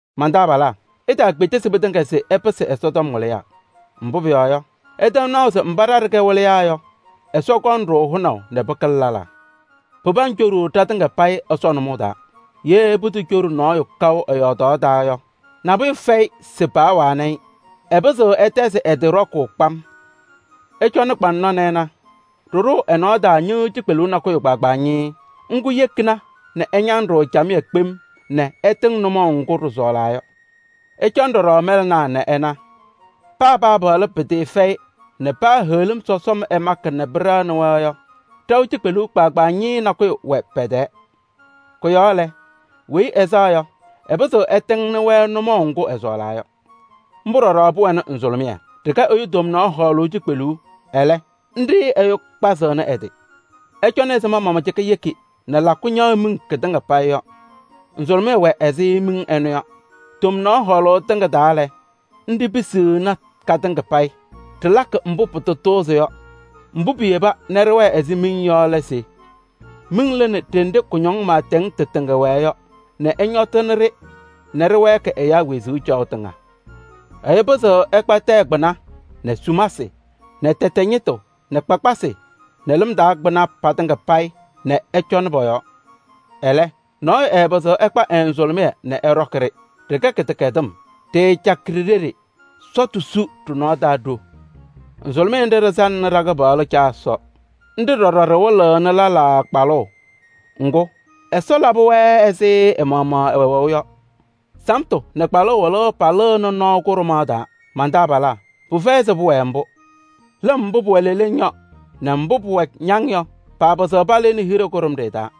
Man-taabalaa! Itaakpedesi mɩtɩŋa se ɩpɩsɩ Ɛsɔtɔm wɩlɩyaa. Mbʋ́ pʋyɔɔ yɔ, ɩtɛm naʋ se mbá ɖa ɖɩkɛ wɩlɩyaa yɔ, Ɛsɔ kɔŋ-ɖʋ hʋnaʋ nɛ pɩkɩlɩ lɛlaa. Pɩpaŋ coɖuu ɖatɩŋa payɩ Ɛsɔ nʋmɔʋ taa. Yee putocoɖi nɔɔyʋ kaʋ ɛ-yɔɔdaɣ taa yɔ, nabʋyʋ fɛyɩ se paawanɩ-ɩ. Ɛpɩzɩɣ ɛtɛzɩ ɛ-tɩ ɖɔkʋʋ kpam. Ɩcɔnɩ kpaŋnɔ nɛ ɩna: ɖɩɖʋʋ ɛ-nɔɔ taa ñɩ́ɣ́yʋ́ʋ cikpeluu nakʋyʋ kpaagbaa ñɩɩɩ. Ŋ́gʋ́ yekina se ɛñam-ɖʋ camɩyɛ kpem nɛ ɛtɩŋ nʋmɔʋ ŋgʋ́ ɖɩsɔɔlaa yɔ. Ɩcɔnɩ ɖɔɖɔ mɛlɛnaa nɛ ɩna: paa paapaɣlɩ pɩtɩɩfɛyɩ nɛ paa heɣlim sɔsɔm ɛmakɩ nɛ pɩɖɛɣnɩ-wɛ yɔ, ɖaʋ cikpeluu kpaagbaa ñɩɩɩ nakʋyʋ wɛ pɛ-tɛɛ. Kʋ-yɔɔ lɛ, weyi ɛsaɣ yɔ, ɛpɩzɩɣ ɛtɩŋnɩ-wɛ nʋmɔʋ ŋgʋ́ ɛsɔɔlaa yɔ. Ḿbʋ́ ɖɔɖɔ pʋwɛnɩ nzʋlʋmɩyɛ, ɖɩkɛ ɛyʋ tomnaɣ hɔɔlʋʋ cikpeluu, ɛlɛ́, ńɖɩ́ ɛyʋ kpazɩɣnɩ ɛ-tɩ. Ɩcɔnɩ ɛzɩma mbʋ́ mamacɩka yeki nɛ lakʋ ñaɣ miŋ kɩtɩŋa payɩ yɔ. Nzʋlʋmɩyɛ wɛ ɛzɩ miŋ ɛnʋ yɔ. Tomnaɣ hɔɔlɩŋ tɩŋa taa lɛ, ńɖɩ́ pisiɣni katɩŋa payɩ: ɖɩlakɩ mbʋ́ pɩtatʋʋzɩ yɔ. Mbʋ́ piyeba nɛ ɖɩwɛɛ ɛzɩ miŋ yɔ lɛ se: miŋ lɩnɩ ɖenɖe kʋñɔŋ maatɛŋ tɩtɩŋa wɛɛ yɔ nɛ ɛñɔtɩ-ɖɩ nɛ ɖɩwɛɛkɩ ɛyáa wezuu caɣʋ tɩŋa. Ɛyʋ pɩzɩɣ ɛkpa tɛyɛ kpɩna nɛ sumasɩ nɛ tɛtɛ ñɩtʋ nɛ kpakpasɩ nɛ lɩm taa kpɩna patɩŋa payɩ nɛ ɛcɔnɩ pɔ-yɔɔ. Ɛlɛ́, nɔɔyʋ ɛɛpɩzɩɣ ɛkpa ɛ-nzʋlʋmɩyɛ nɛ ɛ́ɖɔ́kɩ-ɖɩ: ɖɩkɛ kɩdɛkɛdɩm, ɖɩɩcakɩ ɖi-ɖeɖe, sɔtʋ su ɖɩ-nɔɔ taa ɖo. Nzʋlʋmɩyɛ ńɖɩ́ ɖɩsaŋnɩ ɖa-Kɩpaɣlʋ Caa Ɛsɔ. Ńɖɩ́ ɖɔɖɔ ɖɩwɩlɩɣnɩ lɛlaa kpalʋʋ, ŋgʋ́, Ɛsɔ labɩ-wɛ ɛzɩ ɛ-maɣmaɣ ɛwɛʋ yɔ: samtʋ nɛ kpalʋʋ wɩlʋʋ palɩɣnɩ nɔɔ kʋɖʋmaɣ taa. Man-taabalaa! Pɩfɛyɩ se pʋwɛɛ ḿbʋ́. Lɩm mbʋ́ pʋwɛ leleŋ yɔ nɛ mbʋ́ pʋwɛ ñaŋ yɔ paapɩzɩɣ palɩɩnɩ hiɖe kʋɖʋmɖɩyɛ taa.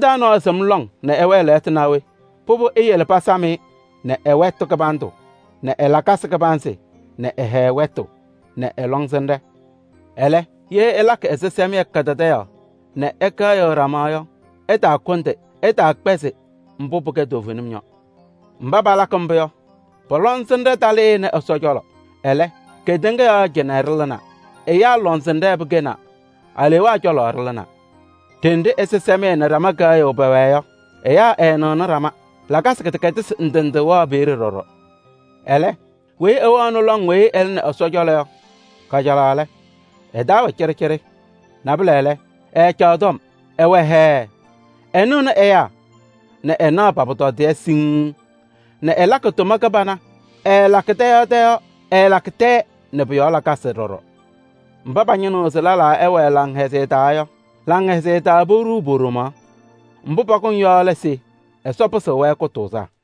Mɩ-taa nɔɔyʋ sɩm lɔŋ nɛ ɛwɛɛ lɛɣtʋ naa we? Pʋdʋ eyele pasɩm-ɩ nɛ ɛ-wɛtʋ kɩbandʋ nɛ ɛ-lakasɩ kɩbanzɩ nɛ ɛ-hɛɛ wɛtʋ nɛ ɛ-lɔŋsɩnɖɛ. Ɛlɛ, ye ɩlakɩ ɛsɩsɛmɩyɛ kadadaɣyaɣ nɛ ɩkɛɣyɩɣ ɖama yɔ, ɩtaakʋndɩ, ɩtaakpɛzɩ mbʋ́ pɩkɛ toovenim yɔ. Mbá palakɩ ḿbʋ́ yɔ, pɔ-lɔŋsɩnɖɛ talɩɩnɩ Ɛsɔ cɔlɔ. Ɛlɛ́, kedeŋa yɔɔ cɩnɛ ɖɩlɩnaa, ɛyáa lɔŋsɩnɖɛ pɩkɛnaa, aleewaa cɔlɔ ɖɩlɩnaa. Đenɖe ɛsɩsɛmɩyɛ nɛ ɖama kɛɣyʋʋ pɛwɛɛ yɔ, ɛyáa ɛɛnɩɣnɩ ɖama. Lakasɩ kɩdɛkɛdɩsɩ ndɩ ndɩ wɛɣ peeɖe ɖɔɖɔ. Ɛlɛ́, weyi ɛwɛɣnɩ lɔŋ weyi ɛlɩnɩ Ɛsɔ cɔlɔ yɔ, kajalaɣ lɛ, ɛ-taa wɛ cɩɖɩcɩɖɩ. Nabʋlɛ lɛ, ɛɛcaɣ tɔm, ɛwɛ hɛɛ, ɛnɩɣnɩ ɛyáa nɛ ɛnaɣ pa-pʋtɔdɩyɛ siŋŋ nɛ ɛlakɩ tʋma kɩbana, ɛɛlakɩ tɛ yɔɔ tɛ yɔɔ, ɛɛlakɩ tɛɛ nɛ pʋ-yɔɔ lakasɩ ɖɔɖɔ. Mbá pañɩnɩɣ se lɛlaa ɛwɛɛ laŋhɛzɩyɛ taa yɔ, laŋhɛzɩyɛ taa poɖuu po-ɖomaɣ. Mbʋ́ pakʋŋ yɔ lɛ se Ɛsɔ pɩsɩɣ-wɛ kʋtʋʋzaa.